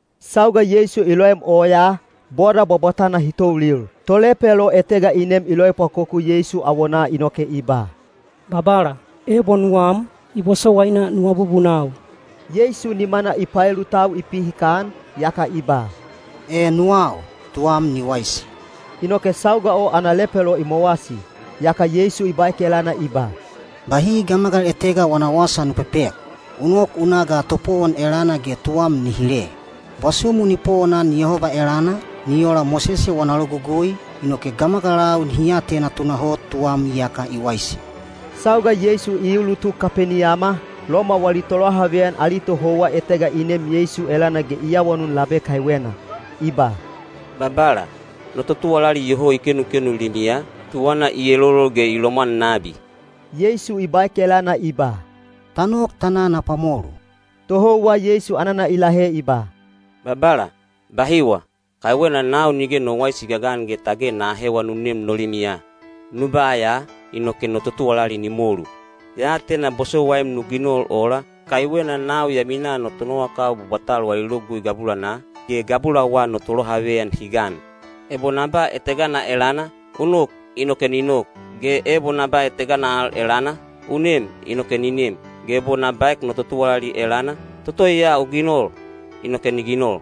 Sauga Yeisu i loem oyaa, boda bwabwatana hi toulil. Tolepelo etega i nem i loepwakoku Yeisu awonaa inoke i ba, “Babala, ebo nuwam, i bosowaina nu abubunau.” Yeisu nimana i paelu tau i pihikan, yaka i ba, “E, nuwau. Tuwam ni waisi!” Inoke sauga o ana lepelo i mowasi. Yaka Yeisu i baek elana i ba, “Bahi gamagal etega wana wasa nu pepek. U nok u na ga topowon elana ge tuwam ni hile. Bwasumu ni powonan Yehoba elana, ni ola Mosese wana logugui, inoke gamagalau nihi atena tunahot tuwam iyaka i waisi.” Sauga Yeisu i ulutuk Kapeniyama, Loma wali tolohaveyan ali tohouwa etega i nem Yeisu elana ge i awanun labe kaiwena. I ba, “Babala, no totuwalali iyoho i kenukenu limiya, tuwana i elolol ge i lomwan nabi.” Yeisu i baek elana i ba, “Ta nok ta na na pwamolu.” Tohouwa Yeisu anana i lahe i ba, “Babala, bahiwa. Kaiwena nau nige no waisi i gagan ge tage na ahewa nu nem no limiya. Nu ba ya, inoke no totuwalali ni molu. Ya atena bosowaim nu ginol ola, kaiwena nau ya minaa no tonowakau bwabwatal wali logugui gabulanaa, ge gabulawa no tolohaveyan hi gan. Ebo na ba etegana elana, ‘U nok,’ inoke ni nok, ge ebo na ba etegana al elana, ‘U nem,’ inoke ni nem. Ge ebo na baek no totuwalali elana, ‘Toto ya u ginol,’ inoke ni ginol.”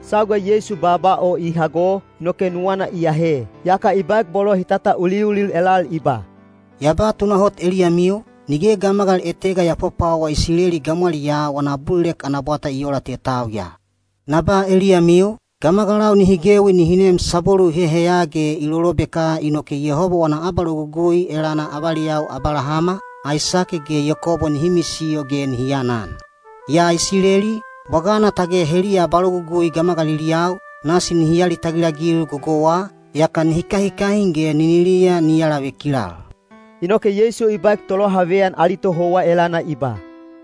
Sauga Yeisu baaba o i hago, inoke nuwana i ahe, yaka i baek bolo hi tatauliulil elal i ba, “Ya ba tunahot eliyamiu, nige gamagal etega ya pwapwawa Isileli gamwaliyaa wana abulilek ana bwata i oola te tau ya. Na ba eliyamiu, gamagalau nihi gewi nihi neem sabwelu i heheya ge i lolobeka inoke Yehoba wana abalogugui elana avaliyau Abalahama, Aisake ge Yakobo nihi misiyo ge nihi anan. Yaa Isileli, bwagana tage heliya abalogugui gamagaliliyau, nasi nihi alitagil-agil gogouwa, yaka nihi kahikahin ge niniliya ni alavekilal.” Inoke Yeisu i baek tolohaveyan ali tohouwa elana i ba,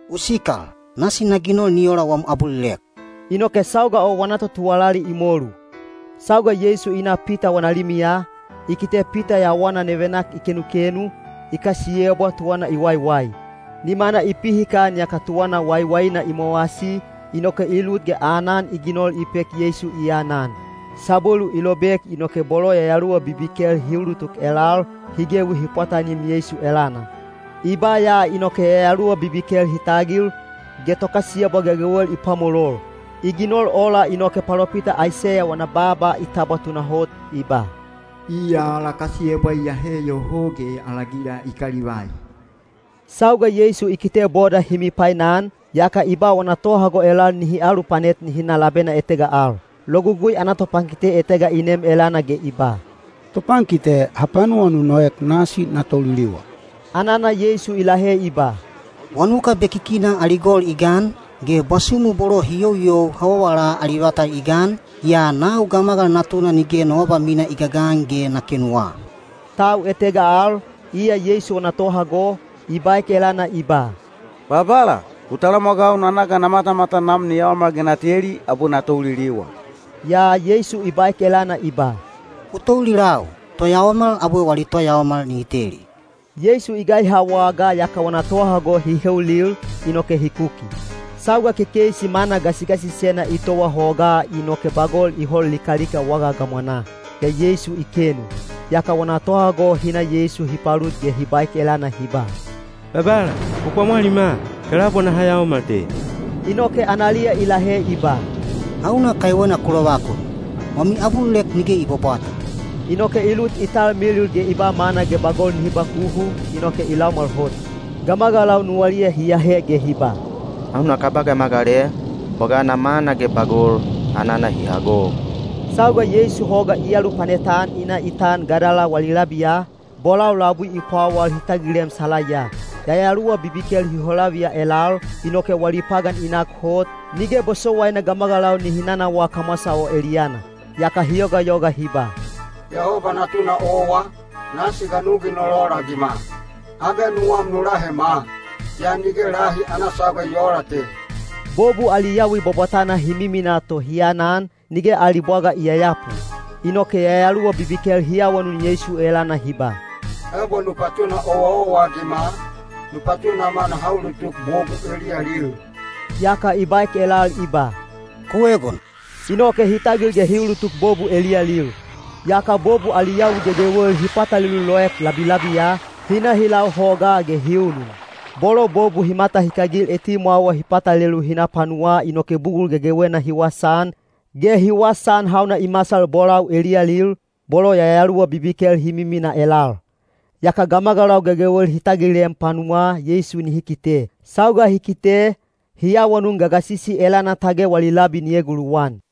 “U sikal! Nasi na ginol ni ola wam abulilek.” Inoke sauga o wana totuwalali i molu. Sauga Yeisu i na Pita wana limiya, i kite Pita yawana nevenak i kenukenu, i kasiyebwa tuwana i waiwai. Nimana i pihikan yaka tuwana waiwaina i mowasi, inoke i lut ge aanan i ginol i pek Yeisu i anan. Sabwelu i lobek inoke bolo yayaluwa bibikel hi ulutuk elal, hi gewi hi pwatanim Yeisu elana. I ba ya inoke yayaluwa bibikel hi tagil, ge tokasiyebwa gegewel i pwamolol. I ginol ola inoke palopita Aiseya wana baaba i tabwa tunahot, i ba, “Iya ala kasiyebwa i ahe yoho ge ala gila i kalivai.” Sauga Yeisu i kite boda hi mipainan, yaka i ba wana tohago elal nihi alupanet nihi na labena etega al. Logugui ana topankite etega i nem elana ge i ba, “Topankite, hapanuwa nu noek, nasi na touliliwa.” Anana Yeisu i lahe i ba, “Wanuka bekikina ali gol i gan, ge bwasumu bolo hi youyou hawawala ali vata i gan, yaa nau Gamagal Natuna nige no abamina i gagan ge na kenuwa.” Tau etega al, iya Yeisu wana tohago, i baek elana i ba, “Babala, u talamwagau na na ga na matamatan nam ni yaomal ge na teli, abwe na touliliwa.” Yaa Yeisu i baek elana i ba, “U toulilau. Toyaomal abwe wali toyaomal nihi teli.” Yeisu i gaiha wagaa yaka wana tohago hi heulil, inoke hi kuki. Sauga kekeisi mana gasigasisena i towa hogaa inoke bagol i hol likalika waga gamwanaa. Yaa Yeisu i kenu. Yaka wana tohago hi na Yeisu hi palut ge hi baek elana hi ba, “Babala, u pwamwalima! Kelaubwa naha yaomal te!” Inoke analiya i lahe i ba, “Hauna kaiwena ku lovakun? Wami abulilek nige i bwabwata.” Inoke i lut i talmilil ge i ba mana ge bagol nihi bakuhu, inoke i laumwal hot. Gamagalau nuwaliya hi ahe ge hi ba, “Hauna kaba gamagal e? Bwagana mana ge bagol, anana hi hago.” Sauga Yeisu hoga i alupanet-an i na i tan Gadala wali labiya, bolau labui i pwawal hi tagilem salaiya. Yayaluwa bibikel hi holaviya elal, inoke wali pagan i nak hot, nige bosowaina gamagalau nihi nanawaa kamwasa o eliyana. Yaka hi yogayoga hi ba, “Yehoba Natuna owa, nasi ga nu ginol ola-agima? Age nuwam nu lahema? Yaa nige lahi ana sauga i oola te.” Bobu ali yawi bwabwatana hi miminaa to hi anan, nige ali bwaga i yayapu. Inoke yayaluwa bibikel hi awanun Yeisu elana hi ba “Ebo nu patuna owaowa-agima, nu patunama naha ulutuk bobu eliyalil.” Yaka i baek elal i ba, “Ku egon!” Inoke hi tagil ge hi ulutuk bobu eliyalil. Yaka bobu ali yawi gegewel hi patalelu loek labilabiya, hi na hi lau hogaa ge hi unun. Bolo bobu hi matahikagil etimwawa hi patalelu hi na panuwaa inoke bugul gegewena hi wasaan, ge hi wasaan hauna i masal bolau eliyalil, bolo yayaluwa bibikel hi miminaa elal. Yaka gamagalau gegewel hi tagilem panuwaa Yeisu nihi kite. Sauga hi kite, hi awanun gagasisi elana tage wali labi ni eguluwan.